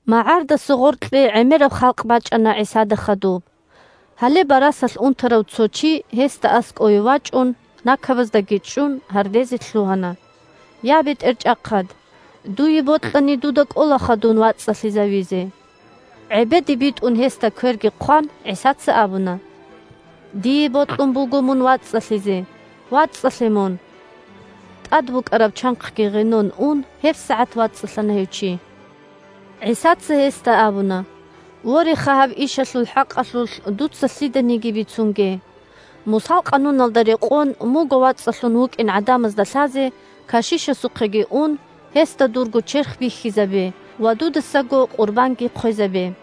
МагӀардаса гъоркье гӀемераб халкъ бачӀана ГӀисада хадуб. Гьале барасалъ унтарав цо чи, гьесда аскӀовеги вачӀун, накабаздаги чӀун, гьардезе лъугьана: – Я, БетӀерчӀахъад! Дуе бокьани, дуда кӀолаха дун вацӀцӀалъизавизе. ГӀебеде битӀун гьесда кверги хъван, ГӀисаца абуна: – Дие бокьун буго мун вацӀцӀалъизе. ВацӀцӀалъе мун! ТӀад букӀараб чанхъги гъенон ун, гьебсагӀат вацӀцӀалъана гьев чи. ГӀисаца гьесда абуна: – Вореха, гьаб ишалъул хӀакъалъулъ дуца лъиданиги бицунге. Мусал Къануналда рекъон, мунго вацӀцӀалъун вукӀин гӀадамазда лъазе, кашишасухъеги ун, гьесда дурго черх бихьизабе ва дудасаго къурбанги хъвезабе.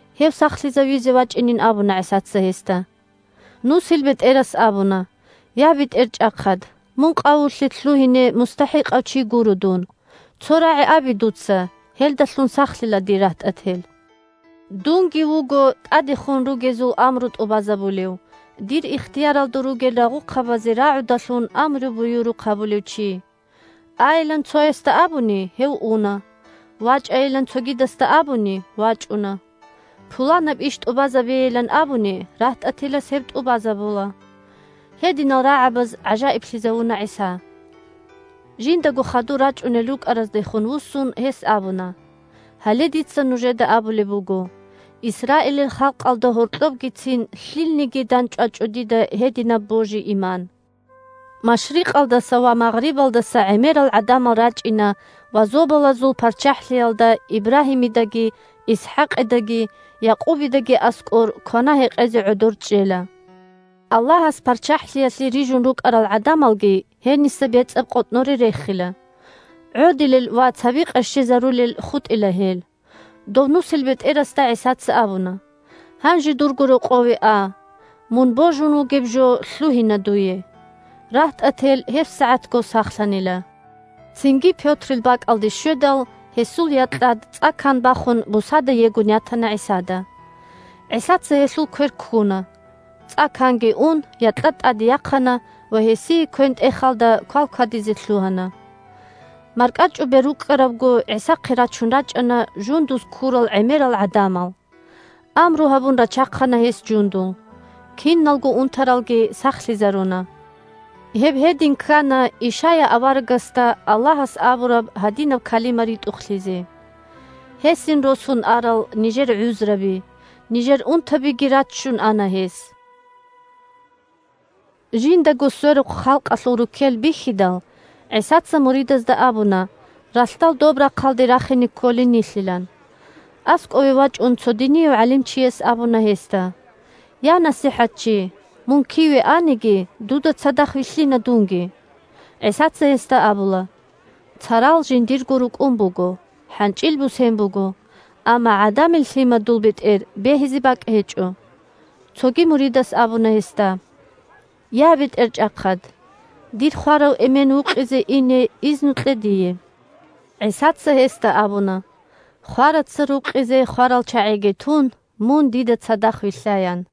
Гьев сахлъизавизе вачӀинин абуна ГӀисаца гьесда. НусилбетӀерас абуна: – Я, БетӀерчӀахъад! Мун къавулъе лъугьине мустахӀикъав чи гуро дун. Цо рагӀи абе дуца, гьелдалъун сахлъила дир рагьтӀател. Дунги вуго тӀадехун ругезул амру тӀубазабулев, дир ихтияралда ругел рагъухъабазе рагӀудалъун амру-буюрухъ гьабулев чи. Айилан цоясда абуни, гьев уна. ВачӀайилан цогидасда абуни – вачӀуна. Пуланаб иш тӀубазабейилан абуни, рагьтӀателас гьеб тӀубазабула. Гьединал рагӀабаз гӀажаиблъизавуна ГӀиса. Жиндаго хадур рачӀунел рукӀараздехун вуссун, гьес абуна: – Гьале дица нужеда абулеб буго: Исраилил халкъалда гьоркьобгицин лъилниги дандчӀвачӀо дида гьединаб божи-иман. Машрикъалдаса ва магърибалдаса гӀемерал гӀадамал рачӀина ва Зобалазул ПарччахӀлъиялда Ибрагьимидаги, ИсхӀакъидаги, Якъубидаги аскӀор квана-гьекъезе гӀодор чӀела. Аллагьас ПарччахӀлъиялъе рижун рукӀарал гӀадамалги гьениса бецӀаб къотӀноре рехила. ГӀодилел ва цаби къерщезарулел хутӀила гьел. Дов нусилбетӀерасда ГӀисаца абуна: – Гьанже дурго рокъове а. Мун божун вугеб жо лъугьина дуе. РагьтӀател гьебсагӀатго сахлъанила. Цинги Пётрил бакӀалде щведал, гьесул якьад цӀа-кан бахун бусада егун ятана ГӀисада. ГӀисаца гьелъул квер ккуна. ЦӀа-канги ун, якьад тӀаде яхъана ва гьесие квен-тӀехалда квалквадизе лъугьана. МаркӀачӀубер рукӀкӀарабго, ГӀисахъе рачун рачӀана жундуз ккурал гӀемерал гӀадамал. Амру гьабун рачахъана гьес жундул. Киналго унтаралги сахлъизаруна. Гьеб гьедин ккана Ишая аварагасда Аллагьас абураб гьадинаб калима ритӀухълъизе: «Гьесин росун арал нижер гӀузраби, нижер унтабиги раччун ана гьес». «Дида цадахъ вилълъа» Жиндаго сверухъ халкъалъул руккел бихьидал, ГӀисаца муридазда абуна ралъдал доб рахъалде рахине кколин нилъилан. АскӀове вачӀун цо динияв гӀалимчияс абуна гьесда: – Я, НасихӀатчи, мун киве аниги, дуда цадахъ вилълъина дунги. ГӀисаца гьесда абула: – Царал жиндирго рукӀун буго, хӀанчӀил бусен буго, амма ГӀадамил Лъимадул бетӀер бегьизе бакӀ гьечӀо. Цоги муридас абуна гьесда: – Я, БетӀерчӀахъад! Дир хварав эмен вукъизе ине изну кье дие. ГӀисаца гьесда абуна: – Хвараца рукъизе хварал чагӀиги тун, мун дида цадахъ вилълъа, – ян.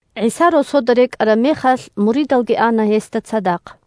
ГӀиса росода рекӀараб мехалъ, муридалги ана гьесда цадахъ.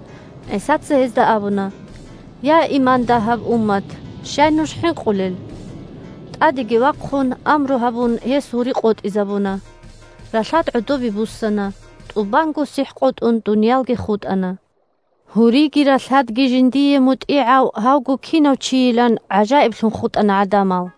ГӀисаца гьезда абуна: – Я, иман дагьаб уммат! Щай нуж хӀинкъулел? ТӀадеги вахъун амру гьабун гьес гьури къотӀизабуна. Ралъад гӀодобе буссана. ТӀубанго сихӀ къотӀун дуниялги хутӀана. Гьуриги ралъадги жиндие мутӀигӀав гьавго кинав чийилан гӀажаиблъун хутӀана гӀадамал.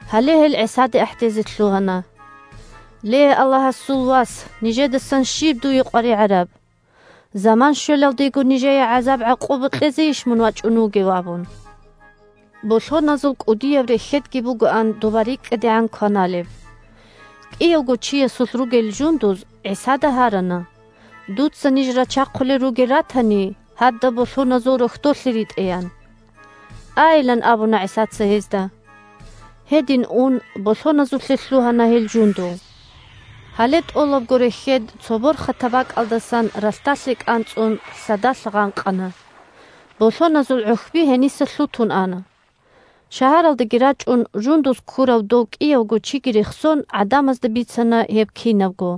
Гьале гьел ГӀисаде ахӀдезе лъугьана: – Ле, Аллагьасул Вас, нижедасан щиб дуе къваригӀараб? Заман щвелалдего нижее гӀакъуба-гӀазаб кьезейищ мун вачӀун вугев? – абун. Болъоназул кӀудияб рехьедги бугоан доба рикӀкӀадегӀан кваналеб. КӀиявго чиясулъ ругел жундуз ГӀисада гьарана: – Дуца ниж рачахъулел ругел ратани, гьадаб болъоназул рохьдолъе ритӀе, – ян. Айилан абуна ГӀисаца гьезда. Гьедин ун болъоназулъе лъугьана гьел жундул. Гьале тӀолабго рехьед цо борхатаб бакӀалдасан ралъдалъе кӀанцӀун, лъадалъ гъанкъана. Болъоназул гӀухьби гьениса лъутун ана. Шагьаралдеги рачӀун, жундуз ккурав дов кӀиявго чиги рехсон, гӀадамазда бицана гьеб кинабго.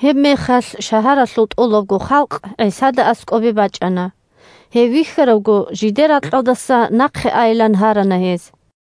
Гьебмехалъ шагьаралъул тӀолабго халкъ ГӀисада аскӀобе бачӀана. Гьев вихьаравго, жидер ракьалдаса нахъе айилан гьарана гьез.